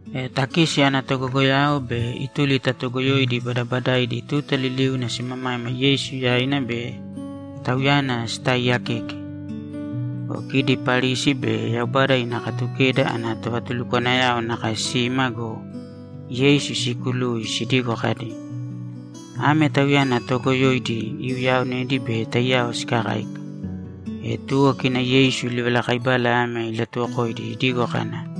E takisi ana togogoyao be ituli ta toogoyoidi badabadaidi tuta liliuna simamaima Yeisu yaina bei Tauyana sitaaiyakeke. Go kidi Parisi be Yaubada ina Katukeda ana tovatulukwanayao nakae sima go, Yeisu siikului sidigo kadi, ‘Ame tauyana toogoyoidi iuyaaonedi be taiyao sikakáika.’ E tuwo kina Yeisu livalakaibala ame ilatuwokoidi idigo kana,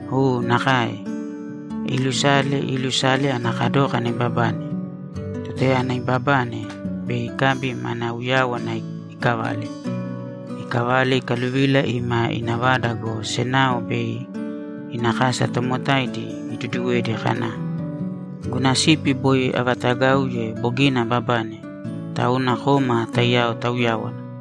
U, nakae. Iilusale, iilusale ana kadókana ibabane. Tutayana ibabane, bei ikabi mana uyáwana ikavale. Ikavale, ikaluvila ima ina vada go, senao be ina kasa tomotaidi iduduwedi kana, “Guna sipi boi avaatagauye bogina ababane, tauna kōma taiyao tauyāwana!”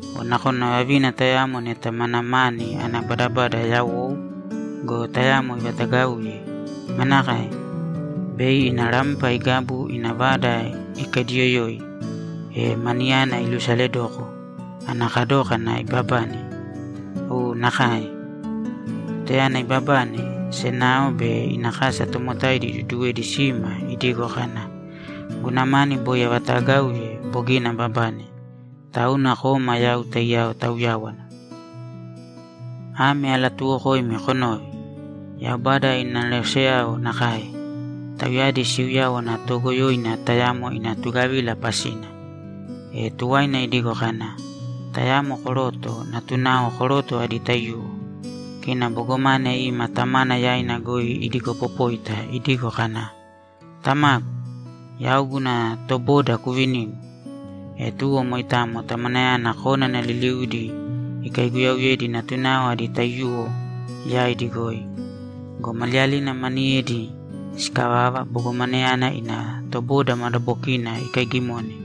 O nakona vavina tayamo neta mana mani ana badabada yawou go, tayamo ivatagauye, manakae? Bei ina rampa igabu, ina vada ikaidiyoyoi, e maniyana ilusaledoko ana kadókana ibabane? U, nakae. Tutayana ibabane, senao be ina kasa tomotaidi iduduwedi sima idigo kana, “Guna mani boi avaatagauye bogina ababane, tauna kōma yau taiyao tauyāwana!” Ame alatuuwokoimi konōve: Yaubada ina aneroseyao nakae. Tauyadi siuyáwana toogoyoina tayamo ina tugavila pasina.’ E tuwaina idigo kana, ‘Tayamo koroto natunao koroto adi taiyuwo. Kina bogomane ima tamana yaina goi idigopopóita idigo kana, “Tamagu, yau guna toboda kuvinīgu.” E tuwo moitamo tamanayana konana liliudi ikaiguyauyedi natunao adi taiyuwo yaidi goi. Go maliyalina maniyedi sikavava, bogomaneyana ina toboda madabokina ikaigimone.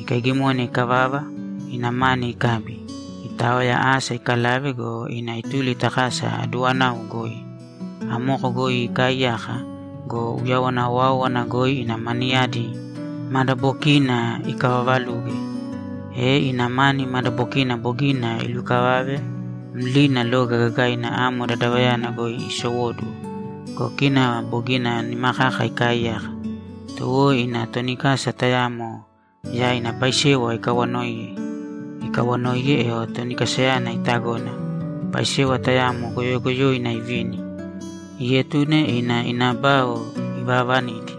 Ikaigimone ikavava, ina mani ikabi, itaoya asa ikalave go, ina ituli ta kasa aduwanau goi. Amoko goi ikaaiyaka go, uyawana owáowana goi ina maniyadi madabokiina ikavavaluge. E ina mani madabokina bogina ilukavave mlina loga gagaina amo dadavayana goi isowóduwo go, kina bogina nima kaka ikaaiyaka. Tuwo ina toni kasa tayamo yaina paisewa ikawanoiye. Ikawanoiye, e toni kasayana itagona, paisewa tayamo goyogoyoina ivini; ietune ina ina bao ivaavanidi.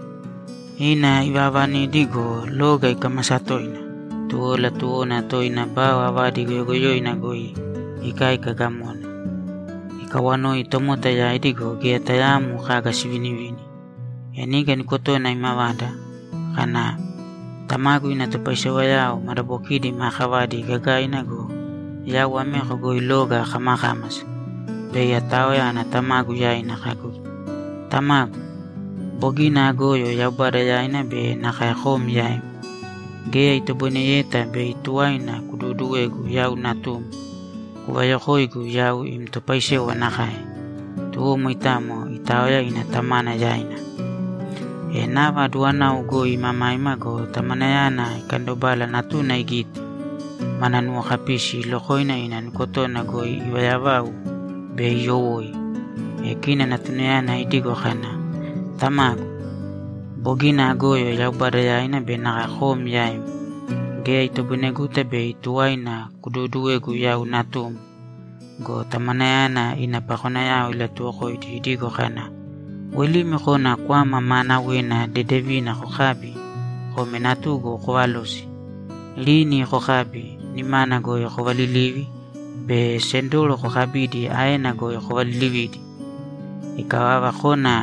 Ina ivaavanidi go, loga ikámasa toina, tuwo latuwona toina bao avadi goyogoyoina goi ikáika gamona. Ikaawanoi tomota yaidi go, geya tayaamo kaga sivinivini. E niga nukotona imavada kana, “Tamagu ina topaisewao madabokidi maa kavadi gagaina go, yau ameko goi loga akamakámasa! Bei ataoya ana tamagu yaina kagu, ‘Tamagu, bogina agoyo Yaubada yaina be nakae kom yaim. Geya itoboineyeta bei tuwaina kuduuduwegu yau natum. Kuvayokōigu yau im topaisewa nakae.’” Tuwo moitamo itaoya ina tamana yaina. E nava aduwanau goi imamaima go, tamanayana ikandobala natuna igite, mana nuwokapisi ilokoina ina nukotona goi ivaayavau be iyowoi. E kina natunayana idigo kana, “Tamagu, bogina agoyo Yaubada yaina be nakae kom yaim. Geya itoboineguta bei tuwaina kuduuduwegu yau natum.” Go tamanayana ina pakonayao ilatuwokoidi idigo kana, “Woilīmi kōna kwama maanawena dedevina kokābi kōme natugu kovalōsi! Rini kokābi, nimana goi kovalilīvi be sendoro kokabīdi aena goi kovalilivīdi! Ikavava, kōna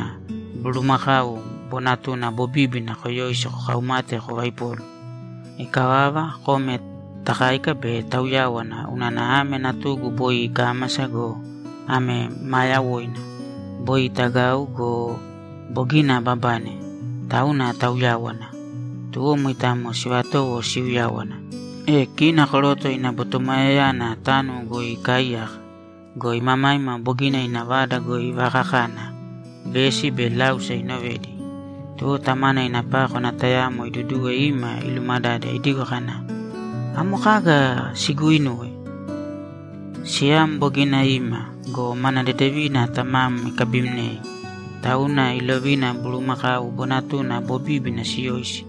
bulumakau bonatuna bobíbina koyōisi kokaumāte kovaipōlu. Ikavava, kōme takāika be tauyāwana unana ame natugu boi ikámasa go, ame maa yawoina! Boi itagau go, bogina ababane. Tauna tauyāwana.” Tuwo moitamo sivatowo siuyáwana. E kina koroto ina botomoyayana tánuwo goi ikaaiyaka go, imamaima bogina ina vada goi ivakakana, vesi be láusa inovedi. Tuwo tamana ina pákwana tayamo iduduwe ima ilumadade idigo kana, “Amo kaga siguuinuwe?” “Siyam bogina ima go, mana dedevina tamam ikabimnei, tauna ilovina bulumakau bonatuna bobíbina siyoisi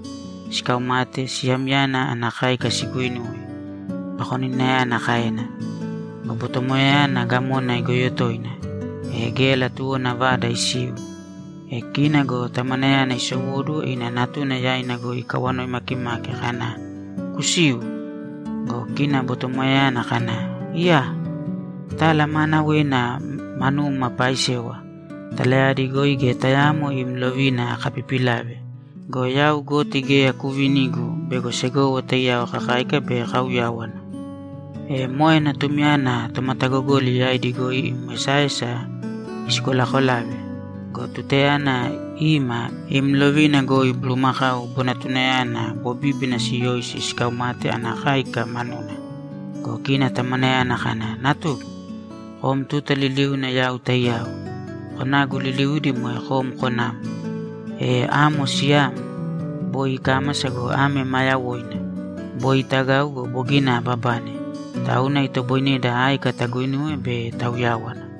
sikaumate siyamyana ana káika siguinuwe”, pakoninayana kaena. Go botomoyayana gamona igoyo toina, e geya latuwona vada isiu. E kina go tamanayana isowóduwo ina natuna yaina goi ikawanoi makimaki kana, “Kusīu.” Go kina botomoyayana kana, “Iyaa! Tala maanawena manum apaaisewa. Talayadi goi geya tayaamo im lovina akapipilave go, yau goti geya kuuvinigu bego segowo taiyao kakáika be kauyáwana. E moe natumyana tomatagogoli yaidi goi im esaesa isikolakolave go, tutayana ima, im lovina goi bulumakau bonatunayana bobíbina siyoisi sikaumate ana káika manuna!” Go kina tamanayana kana, “Natugu, kom tuta liliuna yau taiyao. Konagu liliudi moe kom konam. E amo siyam. Boi ikámasa go, ame maa yawoina. Boi itagau go, bogina ababane, tauna itoboineda áika taguinuwe be tauyáwana.”’